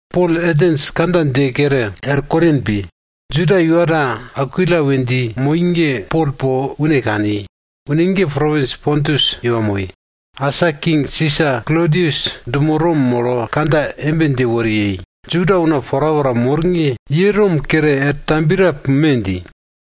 Pol Atens kandja dje kere, er Korin pi. Juda iwa ta Akwila we dji moi ge Pol po une kani. Une ge propins Pontus iwa moi. Asa king Sisa Klodius dumo Rom molo kandja embe dje wori yei, Juda una porapora mor ge, ye Rom kere er tambiye ta pume! dji.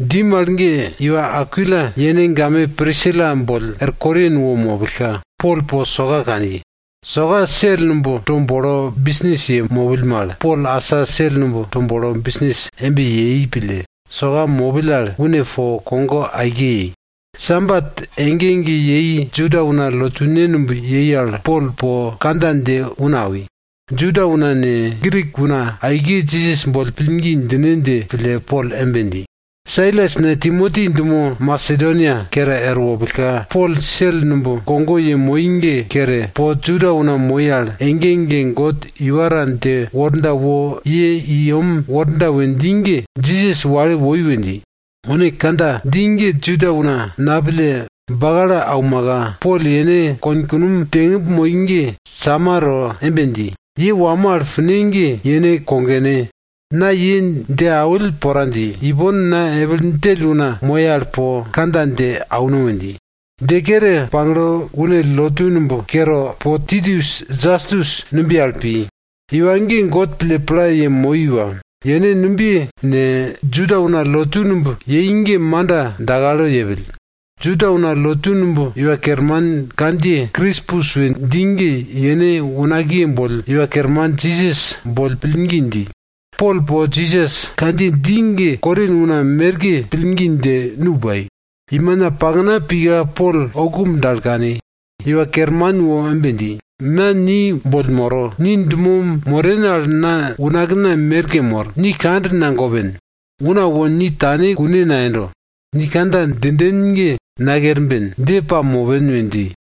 Dji mal ge iwa Akwila yene game Prisila boll er Korin wo mopillka, Pol po soka kani. Soka sel numb to bolo bisnis ye mopill mal Pol asa sel numb to bolo bisnis embe yei pille, soka mopill al une po kogo aike yei. Sabat ege ege yei kune, Juda una lotune numb yei al Pol po kandja dje una awi. Juda una ne, Grik una aike Jisas boll pillgi djine dje pille Pol embe dji. Sailas ne, Timoti dumo Masedonia kere er wopillka, Pol sel numb kogo yemoi ge kere, po Juda una moi al ege ege God iwa ta dje worda wo ye i yem worda we dji ge, Jisas wale woi we dji. Une kandja dji ge Juda una napille, bakalo aumaka, Pol yene konkunom djengimb moi ge sama to embe dji, ye wamo al pine ge yene kogone, na ye dje awill pora dji. Ipon na epil djell una moye al po kandja dje auno we dji. Dje kere pagle une lotu numb kere po Titius Jastus numbiye al pi. Iwa ge God pille pla yemoi iwa. Yene numbiye ne, Juda una lotu numb yei ge manda dakalo yepill. Juda una lotu numb iwa kerman kandjiye Krispus we dji ge yene unakiye boll Iwa Kerman Jisas boll pillgi dji. Pol po Jisas kandjiye dji ge Korin una merke pillgi dje, nu pai. Imina pakna pika Pol oukumb dal kani, Iwa Kerman wo embe dji, na ni boll moro. Ni dumo moren al na unakna merke mor, ni kand nagopen. Una wo ni tane kune nayendo. Ni kandja djinden ge nakerben, dje pamopen we dji.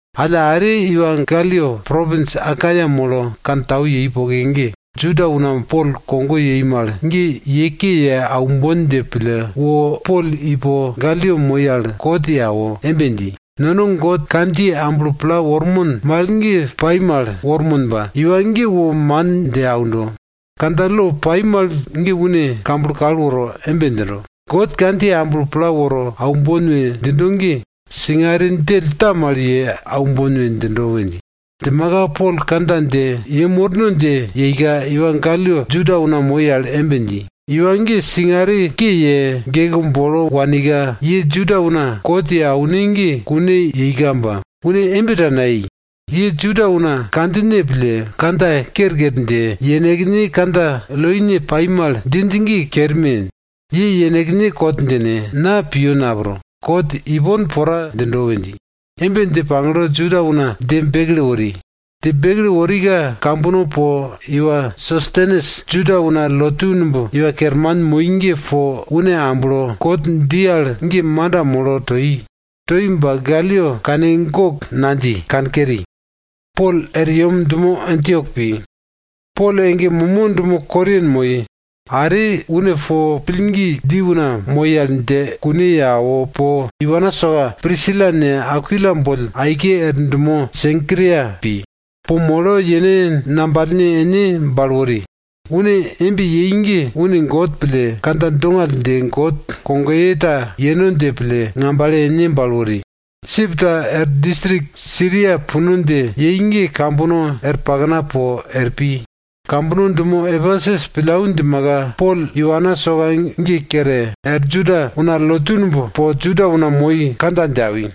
Alla are iwa Galyo propins Akaia molo kantau yei poke ge, Juda una Pol kogo yei mal ge ye ke ye aumbon dje pille wo Pol i po Galyo moi al kot ye awo, embe dji, nono God kandjiye amblo pla wormon mal ge pai mal wormon ba, iwa ge wo man dje aundo. Kandja lo pai mal ge une kamblo kal woro embe djindo, God kandjiye amblo pla woro aumbon we djindo ge, singare djell ta mal ye aumbon we djindo we dji. Djimaka Pol kandja dje yem worno dje yeika, iwa Galyo Juda una moi al embe dji, iwa ge singare ke ye, geke bolo wanika, ye Juda una kot ye aune ge kune yeika ba, une embe ta nayei. Ye Juda una kandjine pille, kandja kerker dje, yenekne kandja loine pai mal djinj ge kerme! Ye yenekne kot djine, na piyo napro. Kot ipon pora djindo! we dji. Embe dje pagle Juda una dje bekle wori. Dje bekle worika, kambono po, iwa Sostenes Juda una lotu numb iwa kerman moi ge po une amblo, kot dji al ge manda molo toi. Toi ba Galyo kane gok nadji, kankeri. Pol ege momo dumo Korin moi. Are, une po pillgi dji una moi al dje kune ye awo po, iwana soka Prisila ne, Akwila boll aike er dumo Senkria pi. Po molo yene ngambale ene bale wori. Une embe yei ge une God pille, kandja dongall dje God kogoye ta yeno dje pille, ngambale ene bale wori. Sip ta er distrik Siria puno dje yei ge, kambono er pakna po er pi. Kambono dumo Epesus pillau djimaka, Pol iwana soka ge kere er Juda una lotu numb po Juda una moi kandja dje awi.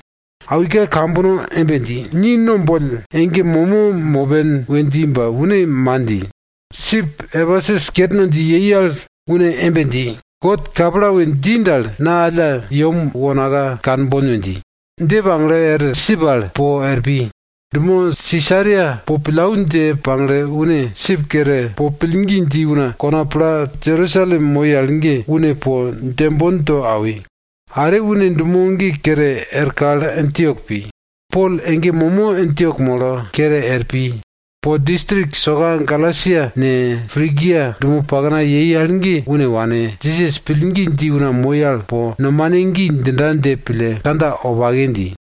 Awika kambono embe dji, ni no boll ege momo mopen we dji ba une man dji. Sip Epesus kerno dje yei al une embe dji, God kapla we dji dal, na alla yem wonaka kanbon we dji. Dje pagle er sip al po er pi. Dumo Sisaria po pillau dje pagle, une sip kere po pillgi dji una kona pla Jerusalem moi al ge une po djembon to awi. Are une dumo ge kere er kal Antiok pi. Pol ege momo Antiok molo, kere er pi. Po distrik soka Galasia ne, Prigia dumo pakna yei al ge une wane, Jisas pillgi dji una moi al po, nomane gi djinda dje pille kandja wopake dji.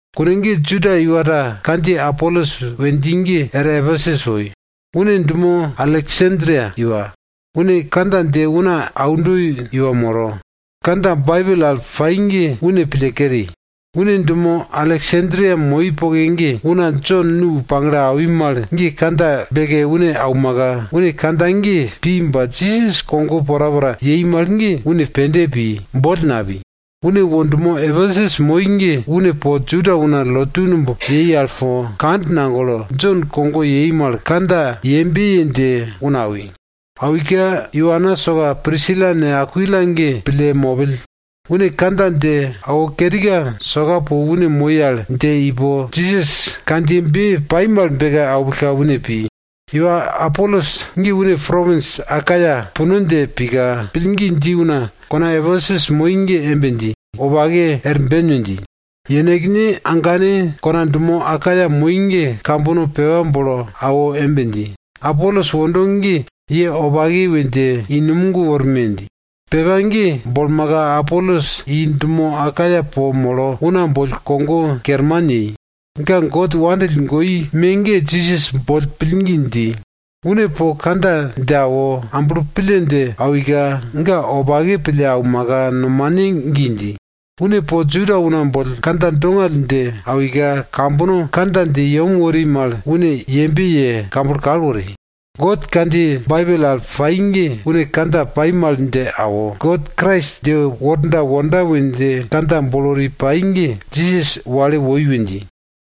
Kune ge Juda iwa ta kandjiye Apolos we dji ge er Epesus woi. Une dumo Aleksandria iwa. Une kandja dje una aundo iwa moro. Kandja Baibel al pai ge une pille keri. Une dumo Aleksandria moi poke ge una Jon nu pagle awi mal ge kandja beke une aumaka, une kandja ge pi ba Jisas kogo porapora yei mal ge une pende pi, boll napi. Une wo dumo Epesus moi ge une po Juda una lotu numb yei al po, kand nagolo, Jon kogo yei mal kandja yembe ye dje una awi. Awika, iwana soka Prisila ne, Akwila ge pille mopill. Une kandja dje awo kerika, soka po une moi al dje ipo, Jisas kandjiyebe pai mal beke aupillka, une pi. Iwa Apolos ge une propins Akaia puno dje pika, pillgi dji una kona Epesus moi ge embe dji, wopake, er ben we dji. Yenekne agane kona dumo Akaia moi ge kambono pepa bolo awo embe dji, Apolos wondo ge ye wopake we dje i numog worme! dji. Pepa ge bolmaka, Apolos i dumo Akaia po molo una boll kogo kerman yei. Ga God wopake pille awika Jisas boll pillgi dji. Une po kandja dje awo, amblo pille dje awika, ga wopake pille aumaka nomane gi dji. Une po Juda una boll kandja dongall dje awika, kambono kandja dje yem wori mal une yembe ye kamblo kal wori. God kandjiye Baibel al pai ge une kandja pai mal dje awo, God Krais dje worda wonda we dje kandja bolo wori pai ge, Jisas wale woi we dji.